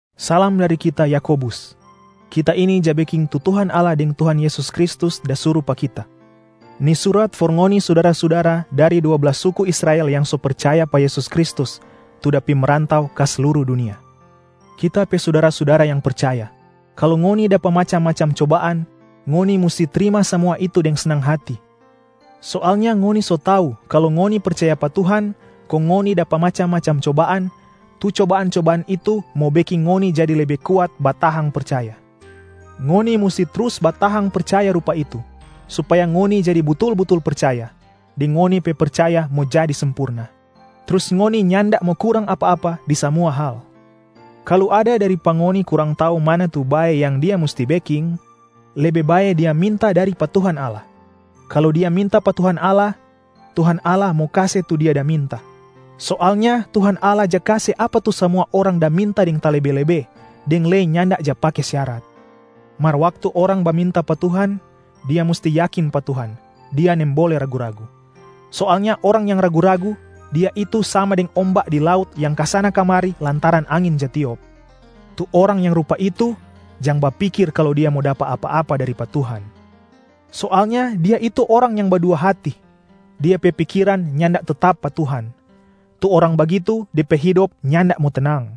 Salam dari kita, Yakobus. Kita ini ja beking tu Tuhan Allah deng Tuhan Yesus Kristus da suru pa kita. Ni surat for ngoni sudara-sudara dari dua blas suku Israel yang so percaya pa Yesus Kristus, tu da pi merantau ka sluru dunia. Kita pe sudara-sudara yang percaya, kalu ngoni dapa macam-macam cobaan, ngoni musti trima samua itu deng snang hati. Soalnya ngoni so tau kalu ngoni percaya pa Tuhan kong ngoni dapa macam-macam cobaan, tu cobaan-cobaan itu mo beking ngoni jadi lebe kuat batahang percaya. Ngoni musti trus batahang percaya rupa itu, supaya ngoni jadi butul-butul percaya, deng ngoni pe percaya mo jadi sempurna. Trus ngoni nyanda mo kurang apa-apa di samua hal. Kalu ada dari pa ngoni kurang tau mana tu bae yang dia musti beking, lebe bae dia minta dari pa Tuhan Allah. Kalu dia minta pa Tuhan Allah, Tuhan Allah mo kase tu dia da minta. Soalnya Tuhan Allah ja kase apa tu samua orang da minta deng talebe-lebe, deng lei nyanda ja pake syarat. Mar waktu orang baminta pa Tuhan, dia musti yakin pa Tuhan, dia nimbole ragu-ragu. Soalnya orang yang ragu-ragu, dia itu sama deng omba di laut yang kasana-kamari lantaran angin ja tiop. Tu orang yang rupa itu, jang bapikir kalu dia mo dapa apa-apa dari pa Tuhan. Soalnya dia itu orang yang badua hati, dia pe pikiran nyanda tetap pa Tuhan. Tu orang bagitu, de pe hidop nyanda mo tenang.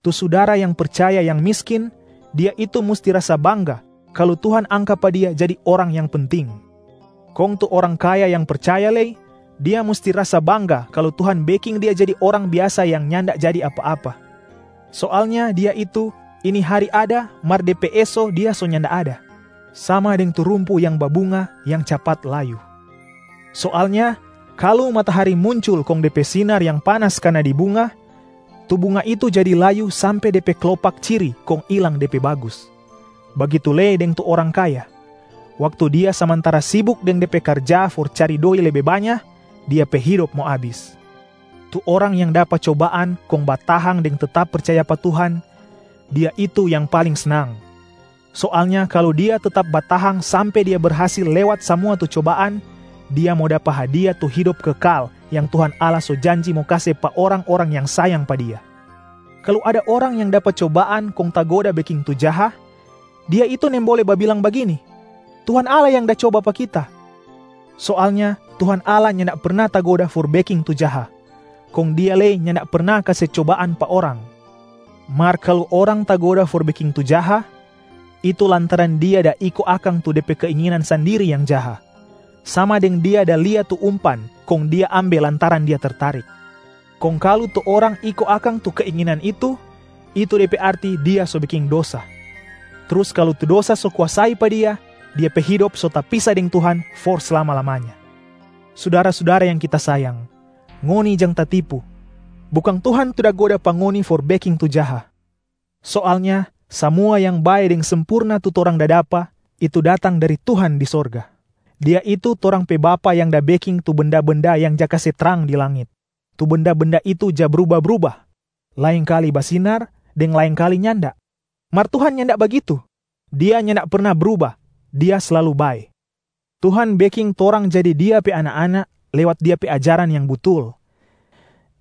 Tu sudara yang percaya yang miskin, dia itu musti rasa bangga kalu Tuhan angka pa dia jadi orang yang penting. Kong tu orang kaya yang percaya lei, dia musti rasa bangga kalu Tuhan beking dia jadi orang biasa yang nyanda jadi apa-apa. Soalnya dia itu ini hari ada mar de pe eso dia so nyanda ada, sama deng tu rumpu yang babunga yang capat layu. Soalnya kalu matahari muncul kong de pe sinar yang panas kana di bunga, tu bunga itu jadi layu sampe de pe klopak ciri kong ilang de pe bagus. Bagitu lei deng tu orang kaya, waktu dia samantara sibuk deng de pe karja for cari doi lebe banya, dia pe hidop mo abis. Tu orang yang dapa cobaan kong batahang deng tetap percaya pa Tuhan, dia itu yang paling snang. Soalnya kalu dia tetap batahang sampe dia berhasil lewat samua tu cobaan, dia mo dapa hadia tu hidop kekal yang Tuhan Allah so janji mo kase pa orang-orang yang sayang pa Dia. Kalu ada orang yang dapa cobaan kong tagoda beking tu jaha, dia itu nimbole babilang bagini, “Tuhan Allah yang da coba pa kita!” Soalnya Tuhan Allah nyanda perna tagoda for beking tu jaha, kong Dia lei nyanda perna kase cobaan pa orang. Mar kalu orang tagoda for beking tu jaha, itu lantaran dia da iko akang tu de pe keinginan sandiri yang jaha, sama deng dia da lia tu umpan kong dia ambe lantaran dia tertarik. Kong kalu tu orang iko akang tu keinginan itu, itu de pe arti dia so beking dosa. Trus kalu tu dosa so kuasai pa dia, dia pe hidop so tapisa deng Tuhan for slama-lamanya. Sudara-sudara yang kita sayang, ngoni jang tatipu, bukang Tuhan tu da goda pa ngoni for beking tu jaha. Soalnya samua yang bae deng sempurna tu torang da dapa, itu datang dari Tuhan di sorga. Dia itu torang pe Bapa yang da beking tu benda-benda yang ja kase trang di langit. Tu benda-benda itu ja bruba-bruba, laengkali basinar deng laengkali nyanda, mar Tuhan nyanda bagitu, Dia nyanda perna bruba, Dia slalu bae. Tuhan beking torang jadi Dia pe anak-anak lewat Dia pe ajaran yang butul,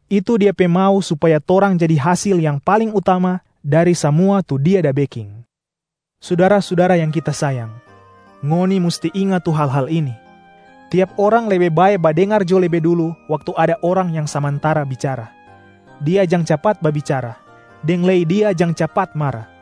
itu Dia pe mau supaya torang jadi hasil yang paling utama dari samua tu Dia da beking. Sudara-sudara yang kita sayang, ngoni musti inga tu hal-hal ini: tiap orang lebe bae badengar jo lebe dulu waktu ada orang yang samantara bicara, dia jang capat babicara, deng lei dia jang capat mara.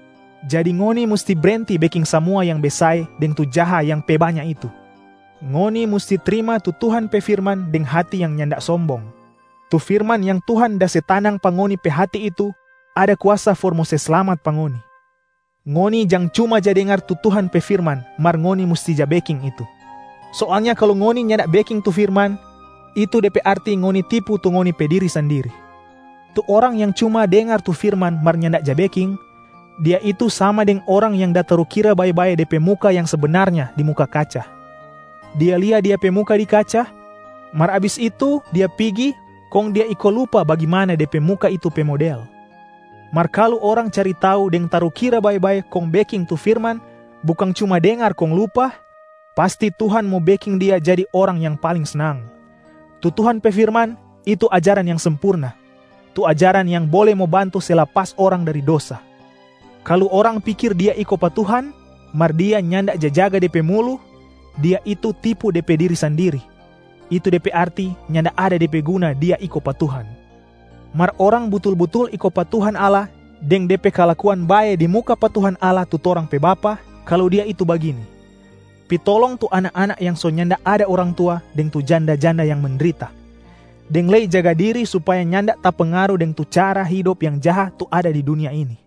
Jadi ngoni musti brenti beking samua yang besae deng tu jaha yang pe banya itu. Ngoni musti trima tu Tuhan pe firman deng hati yang nyanda sombong. Tu firman yang Tuhan da se tanang pa ngoni pe hati itu ada kuasa for mo se slamat pa ngoni. Ngoni jang cuma ja dengar tu Tuhan pe firman mar ngoni musti ja beking itu. Soalnya kalu ngoni nyanda beking tu firman, itu de pe arti ngoni tipu tu ngoni pe diri sandiri. Tu orang yang cuma dengar tu firman mar nyanda ja beking, dia itu sama deng orang yang da tarukira bae-bae de pe muka yang sebenarnya di muka kaca. Dia lia dia pe muka di kaca, mar abis itu dia pigi kong dia iko lupa bagimana de pe muka itu pe model. Mar kalu orang cari tau deng tarukira bae-bae kong beking tu firman bukang cuma dengar kong lupa, pasti Tuhan mo beking dia jadi orang yang paling snang. Tu Tuhan pe firman, itu ajaran yang sempurna, tu ajaran yang bole mo bantu se lapas orang dari dosa. Kalu orang pikir dia iko pa Tuhan, mar dia nyanda ja jaga de pe mulu, dia itu tipu de pe diri sandiri, itu de pe arti nyanda ada de pe guna dia iko pa Tuhan. Mar orang butul-butul iko pa Tuhan Allah deng de pe kalakuan bae di muka pa Tuhan Allah tu torang pe Bapa, kalu dia itu bagini: pi tolong tu anak-anak yang so nyanda ada orang tua deng tu janda-janda yang mendrita, deng lei jaga diri supaya nyanda tapengaru deng tu cara hidop yang jaha tu ada di dunia ini.